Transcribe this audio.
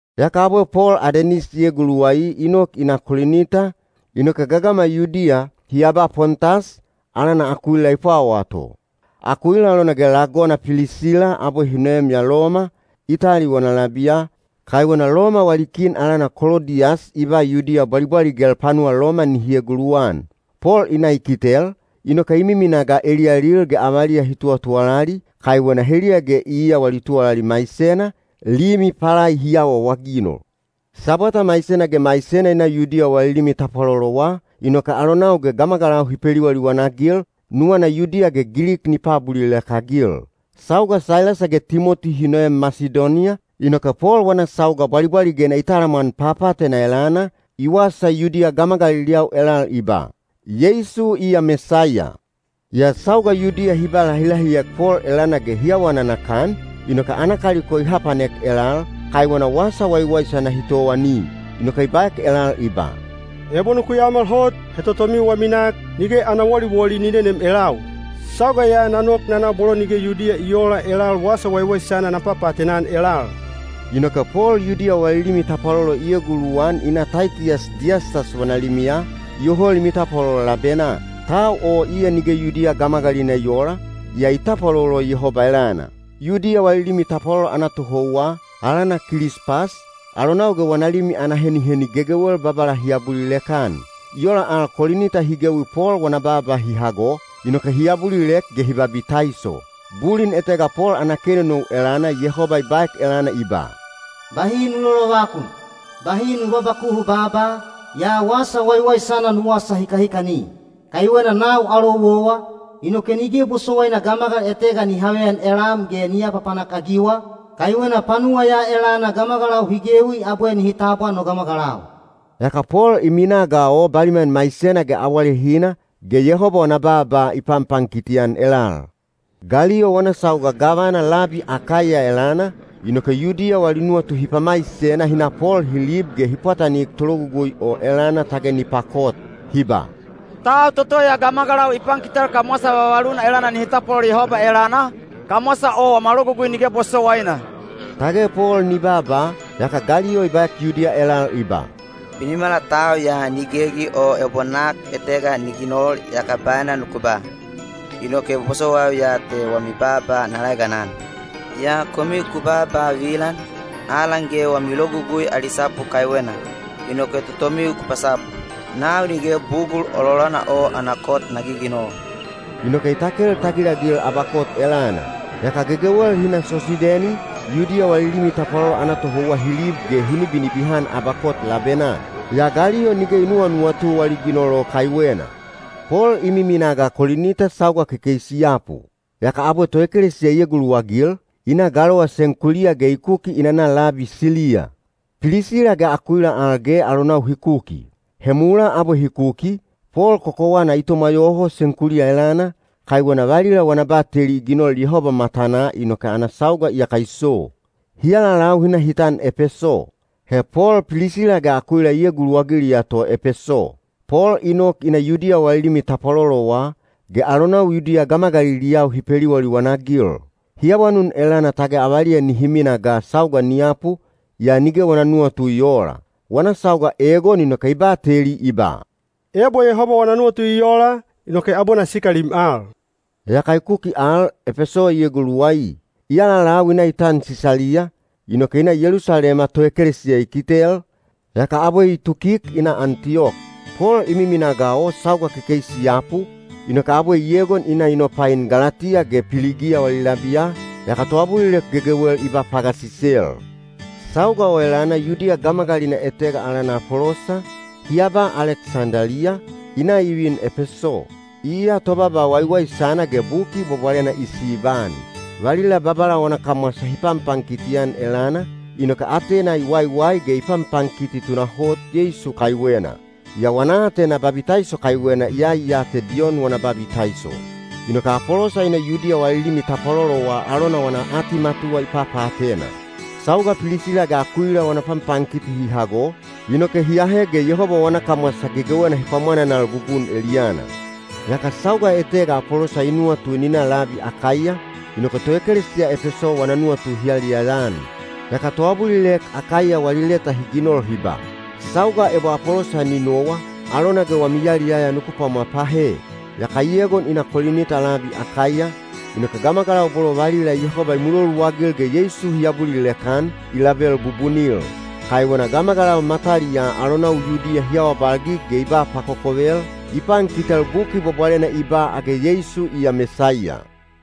Yaka abwe Pol Adenis i eguluwai i nok i na Kolinita, inoke gagama Yudiya, hi aba Pontas, alana Akuila i pwawaa to. Akuila alona ge lagona Pilisila abwe hi noem ya Loma, Itali wana labiya, kaiwena Loma wali kin alana Kolodiyas i ba Yudiya bwalibwaligel panuwa Loma nihi eguluwan. Pol i na i kitel, inoke i miminaa ga eliyalil ge avaliya hi tuwatuwalali, kaiwena heliya ge iya wali tuwalali maisena, limi palai hi awaawaginol. Sabwata maisena ge maisena i na Yudiya wali limi tapwalolowa, inoke alonau ge gamagalau hi peliwaliwan-agil, nuwana Yudiya ge Gilik ni paabulilek-agil. Sauga Sailasa ge Timoti hi noem Masidoniya, inoke Pol wana sauga bwalibwaligena i talamwan papaatena elana, i wasa Yudiya gamagaliliyau elal i ba, “Yeisu iya Mesaiya.” Yaa sauga Yudiya hi ba lahilahiek Pol elana ge hi awa nanakan, inoke ana kaliko i hapanek elal, kaiwena wasa waiwaisana hi towani. Inoke i baek elal i ba, “Ebo nuku yaomal hot, he totomiu wami nak, nige ana woliwoli ni nenem elau. Sauga ya na nok na na bolo nige Yudiya i oola elal wasa waiwaisana na papaatena-an elal.” Inoke Pol Yudiya wali limi tapwalolo i eguluwan i na Taitiyas Diyastas wana limiya, iyoho limi tapwalolo labenaa. Tau o iya nige Yudiya gamagalina i oola, yaa i tapwalolo Yehoba elana. Yudiya wali limi tapwalolo ana tohouwa, alana Kilispas, alonau ge wana limi ana heniheni gegewel Babala hi abulilek-an. I ola al Kolinita hi gewi Pol wana baaba hi hago, inoke hi abulilek ge hi babitaiso. Bulin etega Pol ana kenonou elana Yehoba i baek elana i ba, “Bahi nu lolovakun; bahi nu babakuhu baaba, yaa wasa waiwaisana nu wasa hikahikani. Kaiwena nau alou owa, inoke nige bosowaina gamagal etega ni haveyan elam ge ni apapanak-agiwa, kaiwena panuwa ya elana gamagalau hi gewi abwe nihi tabwa no gamagalau.” Yaka Pol i minaa ga o baliman maisena ge awalehina, ge Yehoba wana baaba i panpankiti-an elal. Galiyo wana sauga gavana labi Akaiya elana, inoke Yudiya wali nuwatu hi pamaisena hi na Pol hi lib ge hi pwatanik tologugui o elana tage ni pakot. Hi ba, “Tau toto ya gamagalau i pankitel kamwasa vavaluna elana nihi tapwalolo Yehoba elana, kamwasa o wama Logugui nige bosowaina.” Tage Pol ni baaba, yaka Galiyo i baek Yudiya elal i ba, “Binimala tau ya ni gegi o ebo nak etega ni ginol yaka baena nuku ba, inoke bosowaiu ya te wami baaba na laeganan. Yaa komiu ku baaba vilan, alan ge wami Logugui ali sapu kaiwena, inoke totomiu ku pasapu. Nau nige bugul ololana o ana kot na giginol.” Inoke i takel tagilagil abakot elana. Yaka gegewel hi na Sosideni, Yudiya wali limi tapwalolo ana tohouwa hi lib ge hi nibinibihan abakot labenaa. Yaa Galiyo nige i nuwanuwatu wali ginol o kaiwena. Pol i miminaa ga Kolinita sauga kekeisi i yapu. Yaka abwe toekelesiya i eguluwagil, i na galowa Senkuliya ge i kuki i nana labi Siliya. Pilisila ge Akuila al ge alonau hi kuki. (He mulaa abwe hi kuki, Pol kokowana i tomwa yoho Senkuliya elana, kaiwena valila wana bateli i ginol Yehoba matanaa inoke ana sauga iyaka i so.) Hi alalau hi na hi tan Epeso. He Pol Pilisila ge Akuila i eguluwagiliya to Epeso. Pol i nok i na Yudiya wali limi tapwalolowa, ge alonau Yudiya gamagaliliyau hi peliwaliwan-agil. Hi awanun elana tage avaliya nihi mina ga sauga ni yapu, yaa nige wana nuwatu i oola. Wana sauga egon inoke i bateli i ba, “Ebo Yehoba wana nuwatu i ola, inoke abwe na sikalim al.” Yaka i kuki al Epeso i eguluwai. I alalau i na i tan Sisaliya, inoke i na Yelusalema toekelesiya i kitel, yaka abwe i tukik i na Antiyok. Pol i miminaa ga o sauga kekeisi i yapu, inoke abwe i egon i na i nopain Galatiya ge Piligiya wali labiya, yaka toabulilek gegewel i ba pagasisel. Sauga o elana Yudiya gamagalina etega alana Apolosa, hi aba Aleksendaliya, i na i vin Epeso. Iya tobaaba waiwaisana ge Buki Bwabwalena i sibaan. Valila Babala wana kamwasa hi panpankiti-an elana, inoke atena i waiwai ge i panpankiti tunahot Yeisu kaiwena. Yaa wana aatena babitaiso kaiwena iyai ya te Diyon wana babitaiso. Inoke Apolosa i na Yudiya wali limi tapwalolowa alona wana atimatuwa i papaatena. Sauga Pilisila ge Akuila wana panpankiti hi hago, inoke hi ahe ge Yehoba wana kamwasa gegewena hi pwamwananal bubun eliyana. Yaka sauga etega Apolosa i nuwatu ni na labi Akaiya, inoke toekelesiya Epeso wana nuwatu hi yaliyaya-an. Yaka toabulilek Akaiya wali leta hi ginol hi ba, “Sauga ebo Apolosa ni nowa, alona ge wami yaliyaya nuku pwamwa pahe.” Yaka i egon i na Kolinita labi Akaiya, inoke gamagalau bolo valila Yehoba i muloluagil ge Yeisu hi abulilek-an, i label bubunil. Kaiwena gamagalau mataliyaa alonau Yudiya hi awabalgig ge i ba pakokovel, i pankitel Buki Bwabwalena i ba age Yeisu iya Mesaiya.